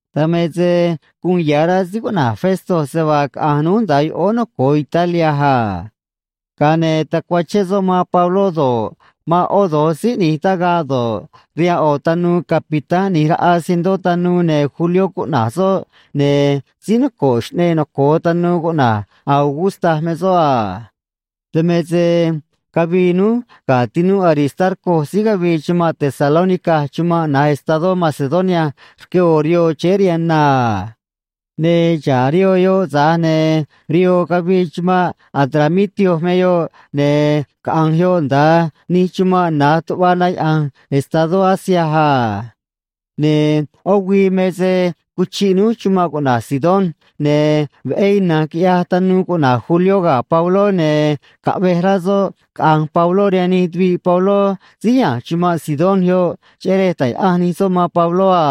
Dan me se guun ya̱ rá síí cuꞌna̱j Festo se vaa caꞌa̱nj núj nda̱a yoꞌóó noco̱o Italia a. Ga̱a ne̱ tacuachén soꞌ man Pabló do̱ꞌ, man ꞌó do̱j síí ꞌni̱j tagaꞌ do̱ꞌ, rihaan ꞌo̱ tanuu capitán ꞌni̱j raꞌa cientó tanuu, ne̱ Julió cuꞌna̱j soꞌ, ne̱ síí noco̱ꞌ xꞌneꞌ noco̱o tanuu cuꞌna̱j Augusta me soꞌ a. Dan me se cavii núj ga̱ tinúꞌ Aristarco síí cavii chumanꞌ Tesalónica chumanꞌ na̱j estadó Macedonia rque ꞌo̱ rihoo chéé rihaan na a. Ne̱ xa̱ꞌ rihoo yoꞌ, tza̱j ne̱ rihoo cavii chumanꞌ Adramitio me yoꞌ, ne̱ caꞌa̱nj yoꞌ nda̱a nij chumanꞌ na̱j tuꞌva na yaꞌa̱nj estadó Asia a. Ne̱ ꞌó güii me se cuchiꞌ núj chumanꞌ cuꞌna̱j Sidón, ne̱ veꞌé ina̱nj quiꞌyaj tanuu cuꞌna̱j Julió ga̱ Pabló, ne̱ caꞌvej rá soꞌ caꞌa̱nj Pabló rihaan nij tuviꞌ Pabló síí ya̱nj chumanꞌ Sidón yoꞌ, cheꞌé rej ta̱j yaꞌanj nij soꞌ man Pabló a.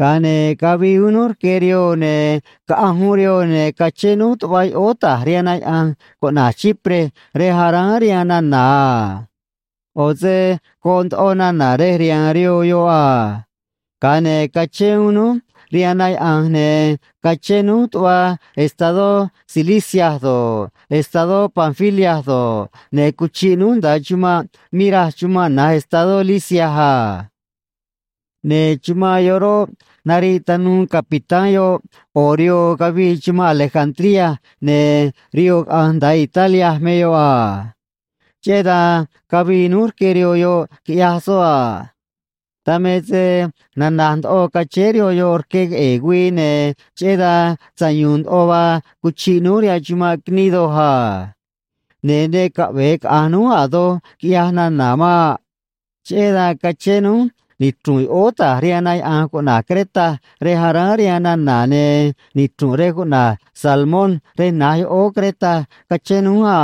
Ga̱a ne̱ cavii uún núj rque rihoo, ne̱ caꞌanj uún rihoo, ne̱ cachén núj tuꞌva yoꞌóó ta̱j rihaan na yaꞌa̱nj cuꞌna̱j Chipre, rej aráán rihaan nana̱ a. ꞌO̱ se goꞌ ndoꞌo nana̱ rej rihaan rihoo yoꞌ a. Ga̱a ne̱ cachén uún núj rihaan na yaꞌa̱nj, ne̱ cachén núj tuꞌva estadó Cilicia do̱ꞌ, estadó Panfilia do̱ꞌ, ne̱ cuchiꞌ núj nda̱a chumanꞌ Mira chumanꞌ na̱j estadó Lisia a. Ne̱ chumanꞌ yoꞌ roꞌ, nariꞌ tanuu capitán yoꞌ ꞌo̱ rihoo cavii chumanꞌ Alejandría, ne̱ rihoo caꞌa̱nj nda̱a Italia me yoꞌ a. Cheꞌé dan cavii núj rque rihoo yoꞌ quiꞌyaj soꞌ a. Dan me se nanaj ndoꞌo cachéé rihoo yoꞌ rque queꞌe̱e̱ güii, ne̱ cheꞌé dan sayu̱u̱n ndoꞌo vaa cuchiꞌ núj rihaan chumanꞌ Gnido a. Ne̱ ne caꞌve̱e caꞌa̱nj núj a̱ doj, quiꞌyaj nana̱ maꞌ. Cheꞌé dan cachén núj nichru̱nꞌ yoꞌóó ta̱j rihaan na yaꞌa̱nj cuꞌna̱j Creta rej aráán rihaan nana̱, ne̱ nichru̱nꞌ rej cuꞌna̱j Salmón rej na̱j yoꞌóó Creta cachén núj a.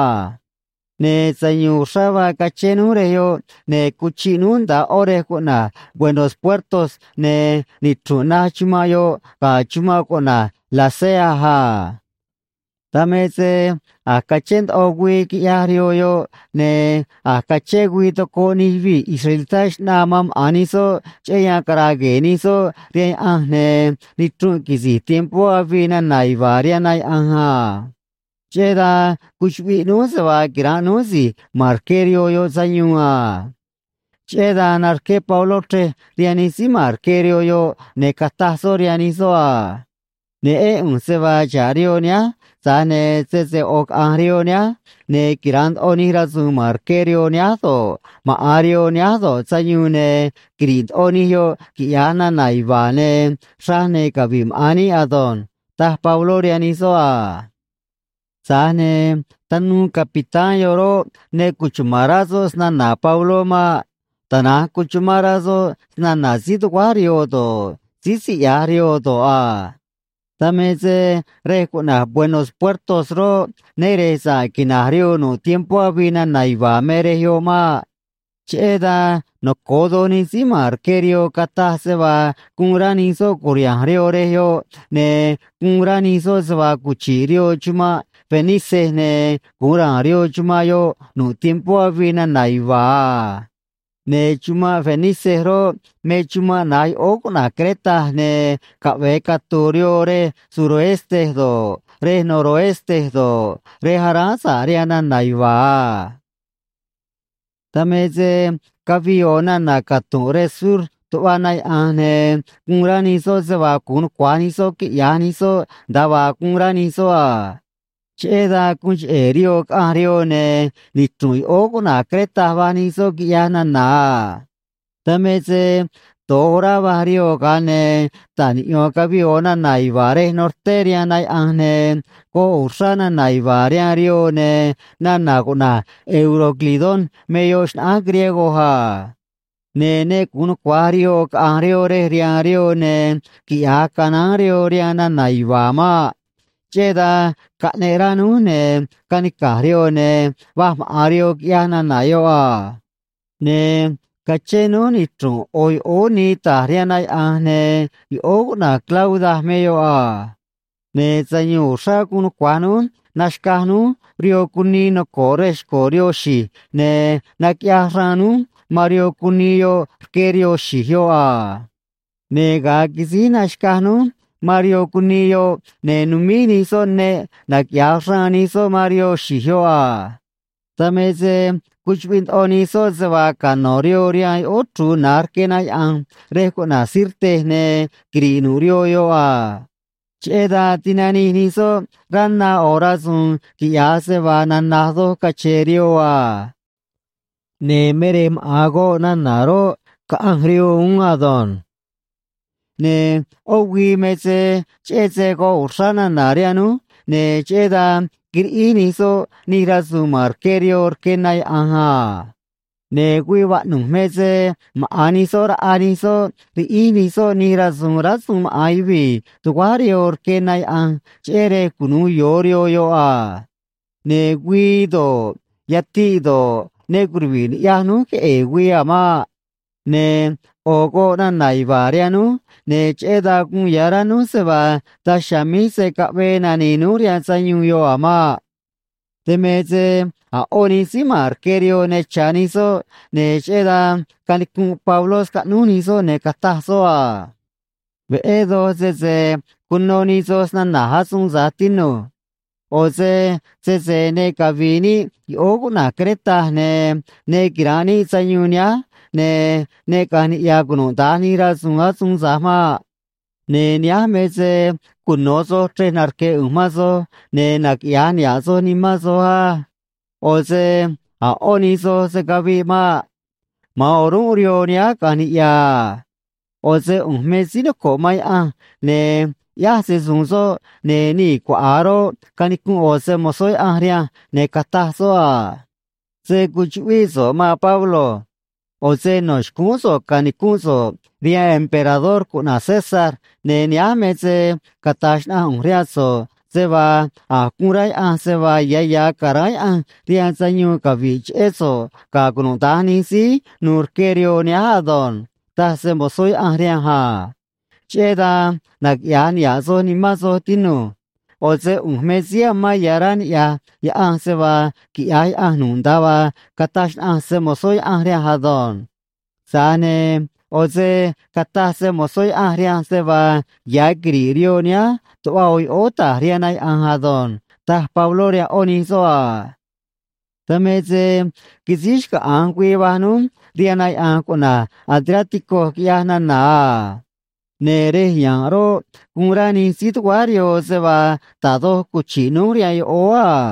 Ne̱ sayu̱u̱n uxrá vaa cachén núj rej yoꞌ, ne̱ cuchiꞌ núj nda̱a ꞌo̱ rej cuꞌna̱j Buenos Puertos, ne̱ nichru̱nꞌ naj chumanꞌ yoꞌ ga̱ chumanꞌ cuꞌna̱j Lasea a. Dan me se a̱j cachén ndoꞌo güii, quiꞌyaj rihoo yoꞌ, ne̱ a̱j cachén güii tocoꞌ nij yuvii̱ israelitá xꞌnaa man maꞌa̱n nij soꞌ cheꞌé yan cara̱a̱ gue̱e̱ nij soꞌ rihaan Yaꞌanj, ne̱ nichrunꞌ quisi̱j tiempó avii nana̱ yuva̱a̱ rihaan na yaꞌa̱nj a. Cheꞌé dan cuchuꞌviꞌ núj se vaa quira̱nꞌ núj si̱j ma̱n rque rihoo yoꞌ sayuun a. Cheꞌé dan narqué Pabló chrej rihaan nij síí ma̱n rque rihoo yoꞌ, ne̱ cataj soꞌ rihaan nij soꞌ a: ―Neꞌén ꞌu̱nj se vaa xa̱ꞌ rihoo nihánj, tza̱j ne̱ sese ꞌo̱ caꞌa̱nj rihoo nihánj, ne̱ quira̱nꞌ ndoꞌo nij rasu̱u̱n ma̱n rque rihoo nihánj do̱ꞌ, maꞌa̱n rihoo nihánj do̱ꞌ, sayuun, ne̱ quiri̱ꞌ ndoꞌo nij yoꞌ, quiꞌya̱j nana̱ yuva̱a̱, ne̱ xraj ne̱ cavi̱ꞌ maꞌa̱n níꞌ ado̱nj ―taj Pabló rihaan nij soꞌ a. Tza̱j ne̱ tanuu capitán yoꞌ roꞌ, ne cuchuma̱n rá soꞌ snana̱ Pabló maꞌ. Tana̱nj cuchumán rá soꞌ snana̱ síí tuguáj rihoo do̱ꞌ, síí siꞌya̱j rihoo do̱ꞌ a. Dan me se rej cuꞌna̱j Buenos Puertos roꞌ, né re̱j sa̱ꞌ quina̱j rihoo nu̱ꞌ tiempó avii nana̱ yuva̱a̱ me rej yoꞌ maꞌ. Cheꞌé dan noco̱o doj nij síí ma̱n rque rihoo cataj se vaa guun rá nij soꞌ cu̱riha̱nj rihoo rej yoꞌ, ne̱ guun rá nij soꞌ se vaa cuchi̱ꞌ rihoo chumanꞌ Fenice ne̱ gu̱un ra̱a̱n rihoo chumanꞌ yoꞌ nu̱ꞌ tiempó avii nana̱ yuva̱a̱ a. Ne̱ chumanꞌ Fenice roꞌ, me chumanꞌ na̱j yoꞌóó cuꞌna̱j Creta, ne̱ caꞌve̱e catu̱u̱ rihoo rej suroeste do̱ꞌ, rej noroeste do̱ꞌ, rej aráán sa̱ꞌ rihaan nana̱ yuva̱a̱ a. Dan me se cavii ꞌo̱ nana̱ catu̱nꞌ rej sur tuꞌva na yaꞌa̱nj, ne̱ guun rá nij soꞌ se vaa gu̱un nucua̱j nij soꞌ quiꞌya̱j nij soꞌ nda̱a vaa guun rá nij soꞌ a. Cheꞌé dan guun cheꞌe̱ rihoo caꞌanj rihoo, ne̱ nichru̱nꞌ yoꞌóó cuꞌna̱j Creta va̱j nij soꞌ quiꞌyaj nana̱ a. Dan me se do̱j orá vaj rihoo, ga̱a ne̱ ta̱j niꞌyo̱n cavii ꞌo̱ nana̱ yuva̱a̱ rej norté rihaan na yaꞌa̱nj, ne̱ goꞌ uxrá nana̱ yuva̱a̱ rihaan rihoo, ne̱ nana̱ cuꞌna̱j Euroclidón me yoꞌ xnaꞌánj griego a. Ne̱ ne gu̱un nucua̱j rihoo caꞌa̱nj rihoo rej rihaan rihoo ne̱ quiꞌya̱j canaán rihoo rihaan nana̱ yuva̱a̱ maꞌ. Cheꞌé dan caꞌneꞌ rá núj, ne̱ canica̱j rihoo ne̱ va̱j maꞌa̱n rihoo, quiꞌyaj nana̱ yoꞌ a. Ne̱ cachén núj nichru̱nꞌ ꞌo̱ yoꞌóó nii ta̱j rihaan na yaꞌa̱nj, ne̱ yoꞌóó cuꞌna̱j Clauda me yoꞌ a. Ne̱ sayu̱u̱n uxrá guun nucua̱j núj naxca̱j núj rihoo cunii noco̱ꞌ rej xco̱ rihoo xi̱j ne̱ naquiꞌyaj xraan núj man rihoo cunii yoꞌ rque rihoo xi̱j yoꞌ a. Ne̱ ga̱a quisíj naxca̱j núj man rihoo cunii yoꞌ, ne̱ numíj nij soꞌ neꞌ naquiꞌya̱j xraan nij soꞌ man rihoo xi̱j yoꞌ a. Dan me se cuchuꞌviꞌ ndoꞌo nij soꞌ se vaa cano̱ rihoo rihaan yoꞌóó chru̱u̱ na̱j rque na yaꞌa̱nj rej cuꞌna̱j Sirte ne̱ quiri̱ꞌ nu̱ꞌ rihoo yoꞌ a. Cheꞌé dan tinanij nij soꞌ rá na ꞌo̱ rasu̱u̱n quiꞌya̱j se vaa nanaj doj cache̱e̱ rihoo a. Ne̱ me rej maꞌa̱n goꞌ nana̱ roꞌ, caꞌanj rihoo uún ado̱nj. Ne̱ ꞌó güii me se cheꞌé se goꞌ uxrá nana̱ rihaan núj, ne̱ cheꞌé dan quiriꞌíj nij soꞌ nij rasu̱u̱n ma̱n rque rihoo rque na yaꞌa̱nj a. Ne̱ güii vaꞌnu̱j me se maꞌa̱n nij soꞌ raꞌa nij soꞌ riꞌíj nij soꞌ nij rasu̱u̱n rásuun maꞌa̱n yuvii̱ tuguáj rihoo rque na yaꞌa̱nj, cheꞌé rej cunu̱u yo̱o rihoo yoꞌ a. Ne̱ güii do̱ꞌ, yatiꞌ do̱ꞌ, ne curuvi̱ꞌ ni̱ꞌyaj núj queꞌe̱e̱ güii a̱ maꞌ. Ne̱ ꞌo̱ goꞌ nana̱ yuva̱a̱ rihaan núj, ne̱ cheꞌé dan guun ya̱ rá núj se vaa daj chiha̱a̱ míj se̱ caꞌvee nani̱i̱ núj rihaan sayuun yoꞌ a̱ maꞌ. Dan me se a̱ ꞌó nij síí ma̱n rque rihoo ne cha̱ nij soꞌ, ne̱ cheꞌé dan canicunꞌ Pabló scaꞌnúj nij soꞌ, ne̱ cataj soꞌ a: ―Veꞌé doj sese cuno nij soj snana̱j asuun tza̱j, tinu̱j. ꞌO̱ se sese ne cavi̱i̱ níꞌ yoꞌóó cuꞌna̱j Creta, ne̱ ne quira̱nꞌ níꞌ sayuun nihánj, ne̱ ne caꞌa̱nj niꞌya̱ cunuda̱nj nij rasu̱u̱n asuun tza̱j maꞌ. Ne̱ nihánj me se cuno̱ soj chrej narque̱ ꞌu̱nj man soj, ne̱ naquiꞌya̱j niha̱ꞌ soj nimán soj á. ꞌO̱ se a̱ ꞌó nij soj se̱ caviꞌ maꞌ. Ma̱an o̱rúnꞌ rihoo nihánj caꞌa̱nj niꞌya̱ a. ꞌO̱ se ꞌu̱nj me síí noco̱ꞌ man Yaꞌanj, ne̱ ꞌyáj se‑su̱u̱n soꞌ, ne̱ nii̱ cuaꞌa̱a roꞌ, canicunꞌ ꞌo̱ se‑mo̱zó Yaꞌanj rihanj, ne̱ cataj soꞌ a: “Se̱ cuchuꞌvíꞌ so̱ꞌ, maan Pablo. ꞌO̱ se no̱ xcúún so̱ꞌ ca̱nicúnꞌ so̱ꞌ rihaan emperador cuꞌna̱j César, ne̱ nihánj me se cata̱j xnaꞌanj ꞌu̱nj rihaan so̱ꞌ se vaa a̱j guun rá Yaꞌanj se vaa ya̱ ya̱ ca̱ráán Yaꞌanj rihaan sayuun cavi̱ꞌ cheꞌé so̱ꞌ ga̱ cunuda̱nj nij síí nu̱u̱ rque rihoo nihánj ado̱nj”, taj se‑mo̱zó Yaꞌanj rihanj a. Cheꞌé dan naquiꞌya̱j niha̱ꞌ soj nimán soj, tinu̱j. ꞌO̱ se ꞌu̱nj me síí amán ya̱ rá niꞌya̱j Yaꞌanj se vaa quiꞌya̱j Yaꞌanj nu̱ꞌ nda̱a vaa cataj xnaꞌanj se‑mo̱zó Yaꞌanj rihanj ado̱nj. Tza̱j ne̱ ꞌo̱ se cataj se‑mo̱zó Yaꞌanj rihanj se vaa ya̱ quiri̱ꞌ rihoo nihánj tuꞌva ꞌo̱ yoꞌóó ta̱j rihaan na yaꞌa̱nj ado̱nj ―taj Pabló rihaan ꞌó nij soꞌ a. Dan me se quisíj xcaꞌa̱nj güii va̱j núj rihaan na yaꞌa̱nj cuꞌna̱j Adriático, quiꞌyaj nana̱ a. Ne̱ rej ya̱nꞌ roꞌ, guun rá nij síí tuguáj rihoo se vaa da̱j doj cuchi̱ꞌ núj rihaan yoꞌóó a.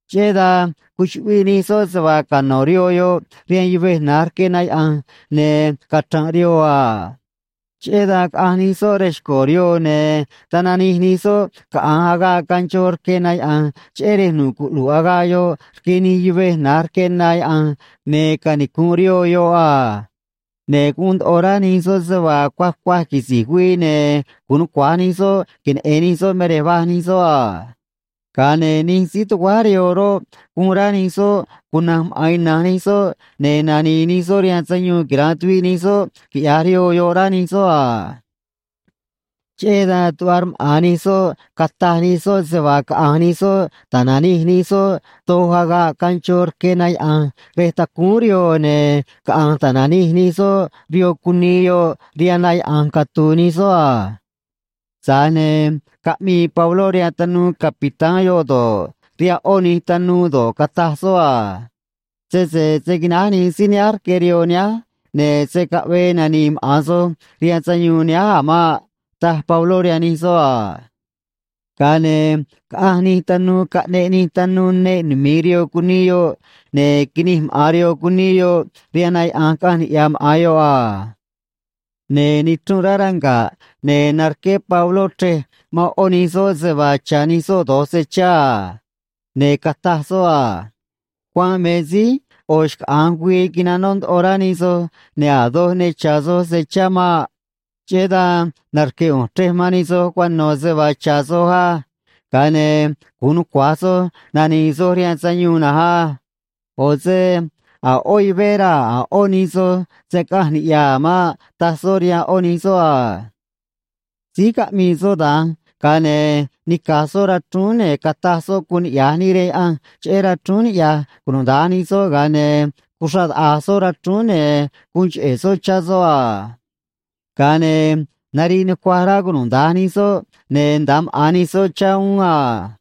Cheꞌé dan cuchuꞌviꞌ nij soꞌ se vaa cano̱ rihoo yoꞌ rihaan yuvej na̱j rque na yaꞌa̱nj ne̱ cachra̱nꞌ rihoo a. Cheꞌé dan caꞌanj nij soꞌ rej xco̱ rihoo, ne̱ tananij nij soꞌ caꞌa̱nj agaꞌ ganchó rque na yaꞌa̱nj, cheꞌé rej nucuꞌlu̱ꞌ agaꞌ yoꞌ rque nij yuvej na̱j rque na yaꞌa̱nj, ne̱ canicu̱nꞌ rihoo yoꞌ a. Ne̱ guun ndoꞌo rá nij soꞌ se vaa cuaj cuaj quisi̱j güii ne̱ gu̱un nucua̱j nij soꞌ queneꞌe̱n nij soꞌ me rej va̱j nij soꞌ a. Ga̱a ne̱ nij síí tuguáj rihoo roꞌ, guun rá nij soꞌ cuna̱nj maꞌa̱n ina̱nj nij soꞌ, ne̱ nani̱i̱ nij soꞌ rihaan sayuun quira̱nꞌ tuviꞌ nij soꞌ quiꞌya̱j rihoo yoꞌ, rá nij soꞌ a. Cheꞌé dan tuꞌva rmaꞌa̱n nij soꞌ cataj nij soꞌ se vaa caꞌa̱nj nij soꞌ ta̱nanij nij soꞌ doj agaꞌ ganchó rque na yaꞌa̱nj rej tacúún rihoo, ne̱ caꞌanj ta̱nanij nij soꞌ rihoo cunii yoꞌ rihaan na yaꞌa̱nj catu̱u̱ nij soꞌ a. Tza̱j ne̱ caꞌmii Pabló rihaan tanuu capitán yoꞌ do̱ꞌ, rihaan ꞌó nij tanuu do̱ꞌ, cataj soꞌ a: ―Sese se̱ quináj nij síí nihánj rque rihoo nihánj, ne̱ se̱ caꞌvee nani̱i̱ maꞌa̱n soj rihaan sayuun nihánj a̱ maꞌ ―taj Pabló rihaan nij soꞌ a. Ga̱a ne̱ caꞌanj nij tanuu, caꞌneꞌ nij tanuu neꞌ numi̱i rihoo cunii yoꞌ, ne̱ quinij maꞌa̱n rihoo cunii yoꞌ rihaan na yaꞌa̱nj, caꞌanj niꞌya̱ maꞌa̱n yoꞌ a. Ne̱ nichrunꞌ rá ranga̱ꞌ, ne̱ narqué Pabló chrej man ꞌó nij soꞌ se vaa cha̱ nij soꞌ do̱j se chá a. Ne̱ cataj soꞌ a: ―Cuanꞌ me síj ꞌo̱ xcaꞌa̱nj güii quinanó ndoꞌo rá nij soj, ne̱ a̱ doj ne cha̱ soj se chá maꞌ. Cheꞌé dan narque̱ ꞌu̱nj chrej man nij soj cuano̱ se vaa cha̱ soj á. Ga̱a ne̱ gu̱un nucua̱j soj nani̱i̱ soj rihaan sayuun na̱nj á. ꞌO̱ se a̱ ꞌó yuvé raa̱ a̱ ꞌó nij soj se̱ caꞌanj niꞌya̱ a̱ maꞌ ―taj soꞌ rihaan ꞌó nij soꞌ a. Síj caꞌmii soꞌ da̱nj, ga̱a ne̱ nica̱j soꞌ rachrúún, ne̱ cataj soꞌ guun niꞌya̱j níꞌ rihaan Yaꞌanj cheꞌé rachrúún niꞌya̱j cunuda̱nj nij soꞌ, ga̱a ne̱ cuxraꞌ taꞌa̱j soꞌ rachrúún, ne̱ guun cheꞌe̱ soꞌ chá soꞌ a. Ga̱a ne̱ nariꞌ nucuaj rá cunuda̱nj nij soꞌ, ne̱ nda̱a maꞌa̱n nij soꞌ chá uún a.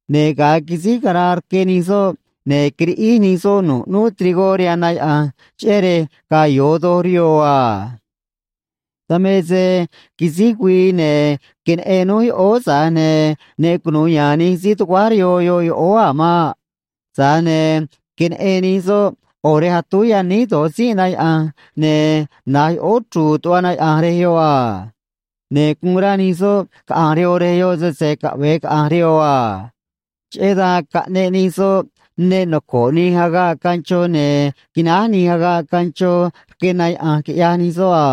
Ne̱ ga̱a quisíj caraa rque nij soꞌ, ne̱ quiriꞌíj nij soꞌ nu̱ꞌ ꞌnúú trigó rihaan na yaꞌa̱nj, cheꞌé rej ga̱a̱ yo̱o doj rihoo a. Dan me se quisíj güii, ne̱ queneꞌen núj yoꞌóó, tza̱j ne̱ ne cunu̱u ya̱a̱n nij síí tuguáj rihoo yoꞌóó yoꞌ a̱ maꞌ. Tza̱j ne̱ queneꞌen nij soꞌ ꞌo̱ rej atúj yaníj do̱j tzínꞌ na yaꞌa̱nj, ne̱ na̱j yoꞌóó chru̱u̱ tuꞌva na yaꞌa̱nj rej yoꞌ a. Ne̱ guun rá nij soꞌ caꞌa̱nj rihoo rej yoꞌ sese caꞌve̱e caꞌa̱nj rihoo a. Cheꞌé dan caꞌneꞌ nij soꞌ neꞌ noco̱ꞌ nij agaꞌ ganchó, ne̱ quináj nij agaꞌ ganchó rque na yaꞌa̱nj, quiꞌyaj nij soꞌ a.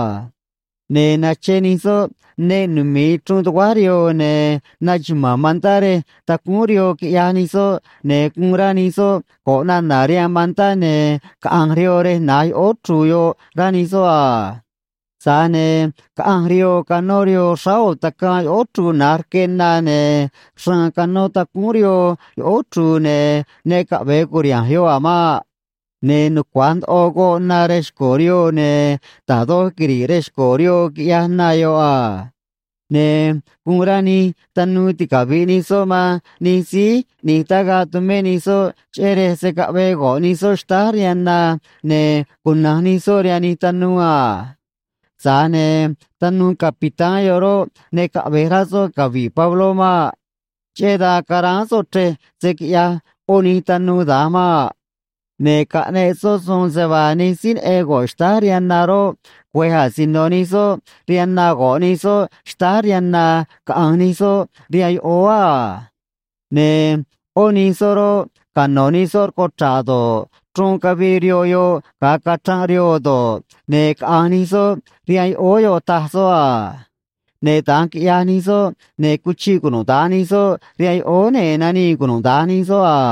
Ne̱ nache nij soꞌ neꞌ numi̱i chruun tuguáj rihoo, ne̱ naxuma̱a̱n mantá rej tacúún rihoo, quiꞌyaj nij soꞌ, ne̱ guun rá nij soꞌ go̱ꞌ nana̱ rihaan mantá ne̱ caꞌa̱nj rihoo rej na̱j yoꞌóó chru̱u̱ yoꞌ, rá nij soꞌ a. Tza̱j ne̱ caꞌanj rihoo canó rihoo xráá ꞌo̱ tacaan yoꞌóó chru̱u̱ na̱j rque na, ne̱ xraan canó tacúún rihoo yoꞌóó chru̱u̱, ne̱ ne caꞌve̱e cu̱riha̱nj yoꞌ a̱ maꞌ. Ne̱ nucua̱j ndoꞌo goꞌ na rej xco̱ rihoo, ne̱ da̱j doj quiri̱ꞌ rej xco̱ rihoo, quiꞌyaj na yoꞌ a. Ne̱ guun rá nij tanuu ticavi̱ꞌ nij soꞌ man nij síí ꞌni̱j tagaꞌ tumé nij soꞌ, cheꞌé rej se̱ caꞌvee go̱ꞌ nij soꞌ xtáj rihaan na ne̱ cuna̱nj nij soꞌ rihaan nij tanuu a. Tza̱j ne̱ tanuu capitán yoꞌ roꞌ, ne caꞌve̱j rá soꞌ cavi̱ꞌ Pabló maꞌ. Cheꞌé dan caráán soꞌ chrej se̱ quiꞌyaj ꞌó nij tanuu da̱nj maꞌ. Ne̱ caꞌneꞌ soꞌ suun se vaa nij síí neꞌen go̱ꞌ xtáj rihaan na roꞌ, güe̱j asino nij soꞌ rihaan na go̱ꞌ nij soꞌ xtáj rihaan na caꞌa̱nj nij soꞌ rihaan yoꞌóó a. Ne̱ ꞌó nij soꞌ roꞌ, cano̱ nij soꞌ rcuchra̱ꞌ do̱ꞌ, chruun cavii rihoo yoꞌ ga̱a cachranꞌ rihoo do̱ꞌ, ne̱ caꞌa̱nj nij soꞌ rihaan yoꞌóó yoꞌ, taj soꞌ a. Ne̱ da̱nj quiꞌyaj nij soꞌ, ne̱ cuchiꞌ cunuda̱nj nij soꞌ rihaan yoꞌóó, ne̱ nanii cunuda̱nj nij soꞌ a.